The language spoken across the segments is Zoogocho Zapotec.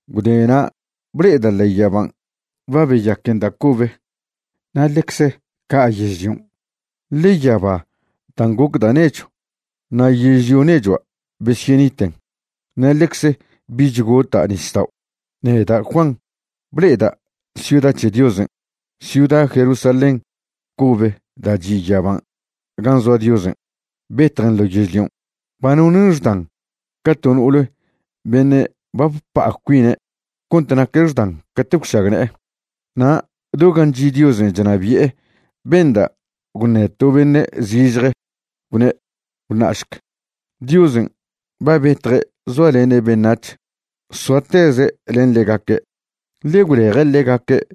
Gwdena' ble'eda' ḻe'e yaban' ba beyaquen da' cobe na' ḻecze ca' yežlion', ḻe yaba dan' goc da' nechw na' yežlio nechua' besyeniten. Na' ḻecze bich gota' nisdao'. Neda' Juan ble'eda' ciuda c̱he Diosen', ciuda Jerusalén cobe da' chi' yaban' gan' zoa Diosen', betjen ḻo yežlion'. Ba nonen' xdan ca to no'ole beṉe' ba bpa'a cuine' cont naque' xdan cate' gwšagne'e. Na' do gan' chi' Diosen' chnabi'e benda' gwṉe to beṉe' zižje, gwne': ―Gwṉa'šc, Diosen' ba betje' zoalene' beṉac̱h. Soateze' len ḻegaque', ḻe gwleje' ḻegaque'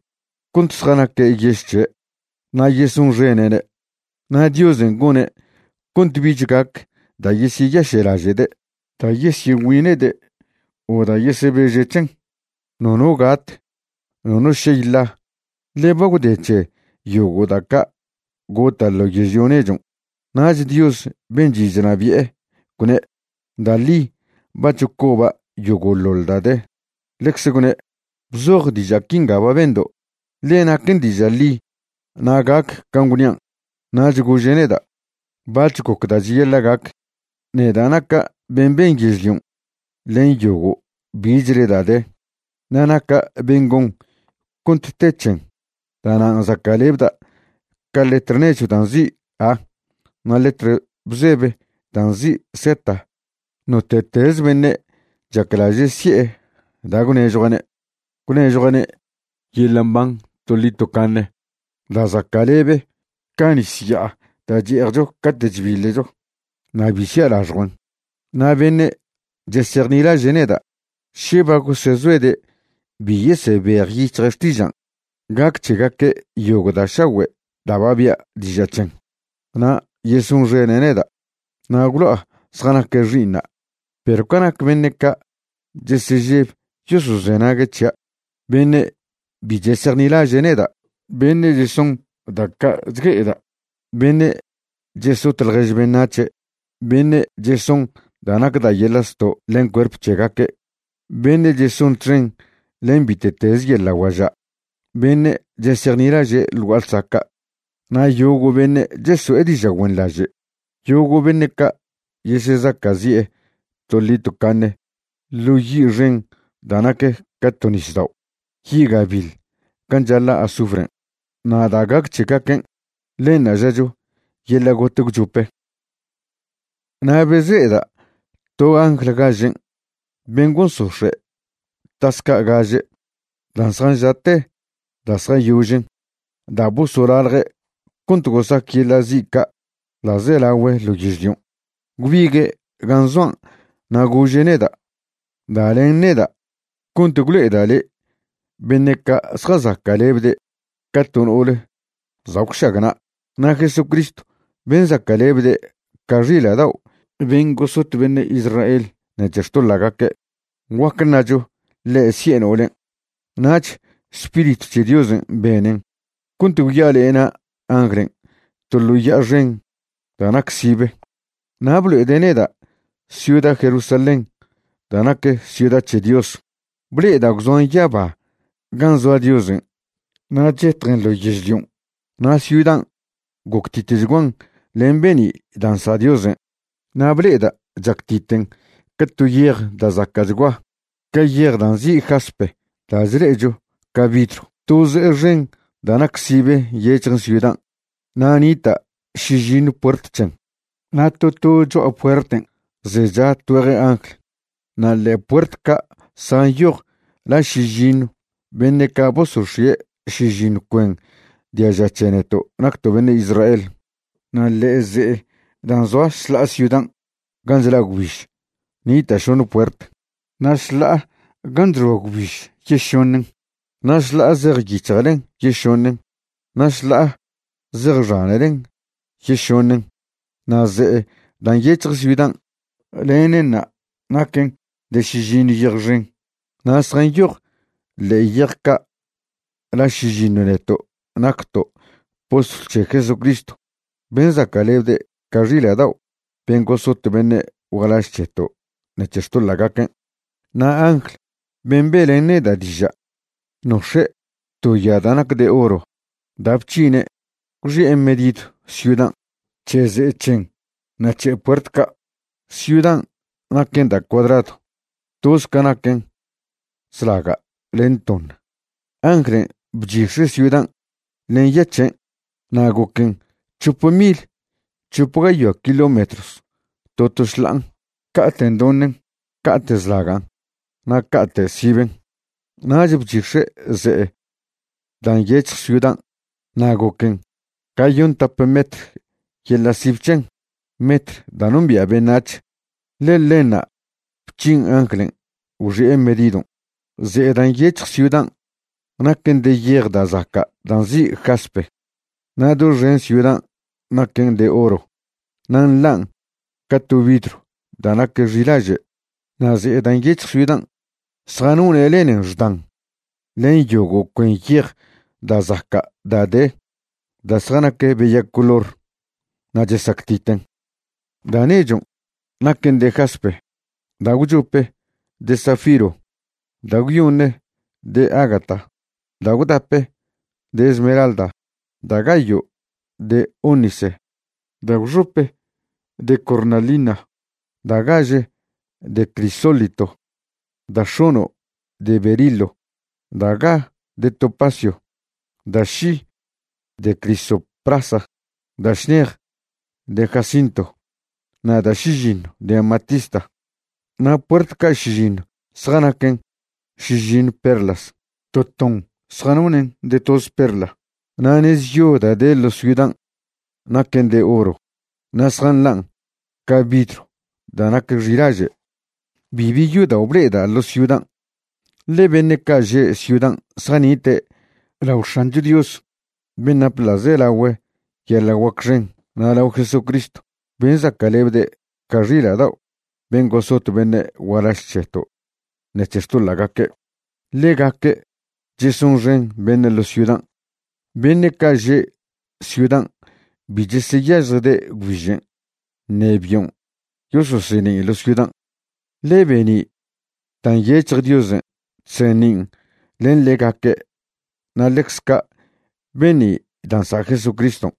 cont zjanaque' yež c̱he', na' yesonxene'ne'. Na' Diosen' gone' cont bich gac da' yesyeyaše'laže'de', da' yesyegüine'de' o da' yesebeže' c̱hen. Nono gat, nono šey ḻa, ḻe ba gwde c̱he yogo' da' ca' gota' ḻo yežlio nechon'. Nach Dios ben' chi' chnabi'e gwne': ―Da' ḻi ba chocoba' yogo'ḻoḻ da' de. Ḻecze gwne': ―Bzoj diža' quinga ba bendo', ḻe naquen diža' ḻi na' gac can' gwnian'. Nach gože' neda': ―Bac̱h goc da' cheyaḻa' gac. Neda' naca' ben' ben yežlion' len yogo' bichle da' de, na' naca' ben' gon cont te c̱hen. Da'nan' zaca'lebda' ca letr nechw da' nzi' A na' letr bzebe da' nzi' Z. Note'teze beṉe' chaclaže' si'e da' gwnežjua'ne', gwnežjua'ne' yeḻa' mban toḻi tocaṉe da' zaca'lebe ca nis ya'a da' che'ejcho cate' chbiḻecho, na' bi sia' laxjuen. Na' beṉe' chesejnilaže' neda', še ba gosezoede' bi yesebejyic̱hje' xtižan', gac c̱hegaque' yogo' da' šagüe' da' ba bia' diža' c̱hen, na' yesonxene' neda', na' gwlo'a zjanaque' xi'iṉa'. Perw ca nac beṉe' ca' chesežeb yosozenague' c̱hia', beṉe' bi chesejnilaže' neda', beṉe' cheson da' ca' chgue'eda', beṉe' chesot ḻjež beṉac̱he', beṉe' cheson da' nac da' yeḻa' zto' len cuerp c̱hegaque', beṉe' cheson txen len bite'teze yeḻa' guaža', beṉe' chesejnilaže' ḻ gua'a ḻsaca', na' yogo' beṉe' cheso'e diža' güenḻaže', yogo' beṉe' ca' yesezaca'zi'e toḻi tocaṉe ḻo yi' xen da' nac ca to nisdao', yi' gabiḻ gan' chaḻa' azufren'. Na' da' gac c̱hegaquen', ḻenṉa' žacho yeḻa' got gwchope. Na' bezle'eda' to angl gažen' ben' gosox̱e' tas ca' gaže dan' zjanža'te da' zjayožen da' bosolalje' cont gosac yeḻa' zi' ca' ḻa'zelagüe ḻo yežlion'. Gwbigue' gan' zoan' na' gože' neda': ―Da len neda' cont gwlo'eda' le' beṉe' ca' zjazaca'lebde' ca to no'ole za' gwšagna'. Na' Jesucristw ben' zaca'lebde' ca xila' dao' ben' gosot beṉe' Israel ṉec̱he xtoḻa'gaque', guac ṉacho ḻe' si'e no'olen'. Nach Spiritw c̱he Diosen' benen cont gwya'alena' anglen' to ḻo ya'a xen da' nac sibe, na' blo'ede' neda' ciuda Jerusalén da' nac ciuda c̱he Dios. Ble'eda' gwzoan yaba gan' zoa Diosen' na' chetjen ḻo yežlion'. Na' ciudan' goctitchguan len be'ni' da' nsa' Diosen', na' ble'eda' chactiten ca to yej da' zaca'chgua, ca yej da' nzi' jaspe da' chle'echo ca vidrw. To ze'e xen da' nac sibe nyec̱hjen ciudan', na' nita' šižiṉw puert c̱hen, na' to to cho'a puerten' zecha tgüeje angl. Na' ḻe'e puert ca' zjanyoj la šižiṉw beṉe' ca' bosox̱ie' šižiṉw cuen diaža c̱he neto' nacto' beṉe' Israel. Na' ḻe'e ze'e dan' zoa šḻa'a ciudan' gan' chla' gwbiž nita' šoṉe puert, na' šḻa'a gan' chxoa gwbiž yešoṉen, na' šḻa'a zej yic̱hjelen yešoṉen, na' šḻa'a zej xanelen yešoṉen. Na' ze'e dan' nyec̱hje ciudan', lenenṉa' naquen de šižiṉw yej xen, na' zjanyoj ḻe'e yej ca' la šižiṉw neto' nacto' postlw c̱he Jesucristw ben' zaca'lebde' ca xila' dao' ben' gosot beṉe' gualaž c̱heto' ṉec̱he xtoḻa'gaquen'. Na' angl ben' be'len neda' diža' nox̱e' to ya da' nac de oro da' bc̱hine' gwxi'e medidw ciudan', c̱he ze'e c̱hen na' c̱he puert ca'. Ciudan' naquen da' cuadradw, toze ca naquen zlaga' len toṉ. Anglen' bchix̱e' ciudan' len ya c̱hen' na' goquen c̱hope mil c̱hope gayoa kilómetros to to šḻa'an, ca'te' ndoṉen, ca'te' zlagan' na' ca'te' siben'. Nach bchix̱e' ze'e dan' nyec̱hj ciudan' na' goquen gayontap metr yeḻa' sib c̱hen, metr da' nombia' beṉac̱h, ḻe ḻenṉa' bc̱hin anglen' gwxi'e medidon'. Ze'e da' nyec̱hj ciudan' naquen de yej da' zaca' da' nzi' jaspe, na' doxen ciudan' naquen de oro na' nḻan' ca to vidrw da' nac xilaže'. Na' ze'e da' nyec̱hj ciudan', zjanone' lenen xdan len yogo' cuen yej da' zaca' da' de da' zjanac beya color na' chesactiten. Da' nechon' naquen de jaspe; da' gwchope de zafiro; da' gwyoṉe de ágata; da' gwdape de esmeralda; da' gayo' de ónice; da' gwxope de cornalina; da' gaže de crisólito; da' x̱ono' de berilo; da' ga de topacio; da' ši de crisoprasa; da' šnej de jacinto; na' da' šižiṉw de amatista. Na' puert ca' šižiṉw zjanaquen šižiṉw perlas, to ton zjanonen' de toze perla. Na' nez yo da' de ḻo ciudan' naquen de oro na' zjanḻan' ca vidrw da' nac xilaže'. Bibi yodao' ble'eda' ḻo ciudan', ḻe beṉe' ca' že' ciudan' zjanite' lao X̱ancho Dios ben' nap ḻa'zelagüe yeḻa' guac xen na' lao Jesucristw ben' zaca'lebde' ca xila' dao' ben' gosot beṉe' gualaž c̱heto' ṉec̱he xtoḻa'gaque'. Ḻegaque' chesonxen beṉe' ḻo ciudan'. Beṉe' ca' že' ciudan' bi cheseyažjde' gwbižen' ṉe bion' yososeṉin' ḻo ciudan', ḻe be'ni' da' nyec̱hj Diosen' chseṉin' len ḻegaque' na' ḻecz ca' be'ni' da' nsa' Jesucriston'.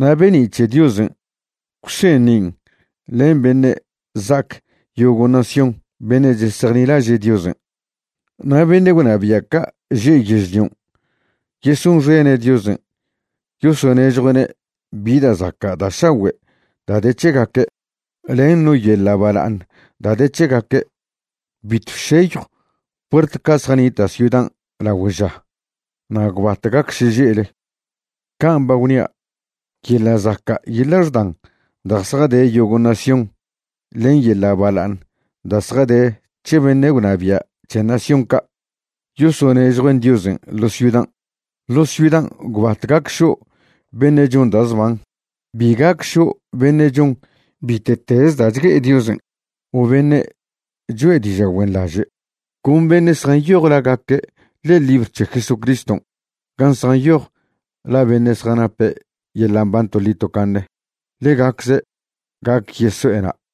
Na' be'ni' c̱he Diosen' gwseṉin' len beṉe' za'ac yogo' nación beṉe' chesejnilaže' Diosen', na' beṉe' gwnabia' ca' že' yežlion' yesonxene' Diosen' yosonežjue'ne' bi da' zaca' da' šagüe' da' de c̱hegaque', len no yeḻa' bala'aṉ da' de c̱hegaque'. Bitw šeyjw puert ca' zjanita' ciudan' lagüe' ža, na' gwbat gac šeže'le. Can' ba gwnia', yeḻa' zaca' yeḻa' xdan da' zjade yogo' nación len yeḻa' bala'aṉ da' zjade c̱he beṉe' gwnabia' c̱he nación ca', yosonežjuen' Diosen' ḻo ciudan'. Ḻo ciudan' gwbat gac šo' beṉe' chon da' zban. Bi gac šo' beṉe' chon bite'tez da' chgue'e Diosen' o beṉe' choe' diža' güenḻaže'. Con beṉe' zjanyoj lagaque' ḻe'e libr c̱he Jesucriston' gan' zjanyoj la beṉe' zjanape' yeḻa' mban toḻi tocaṉe, ḻegacze' gac yeso'e na'.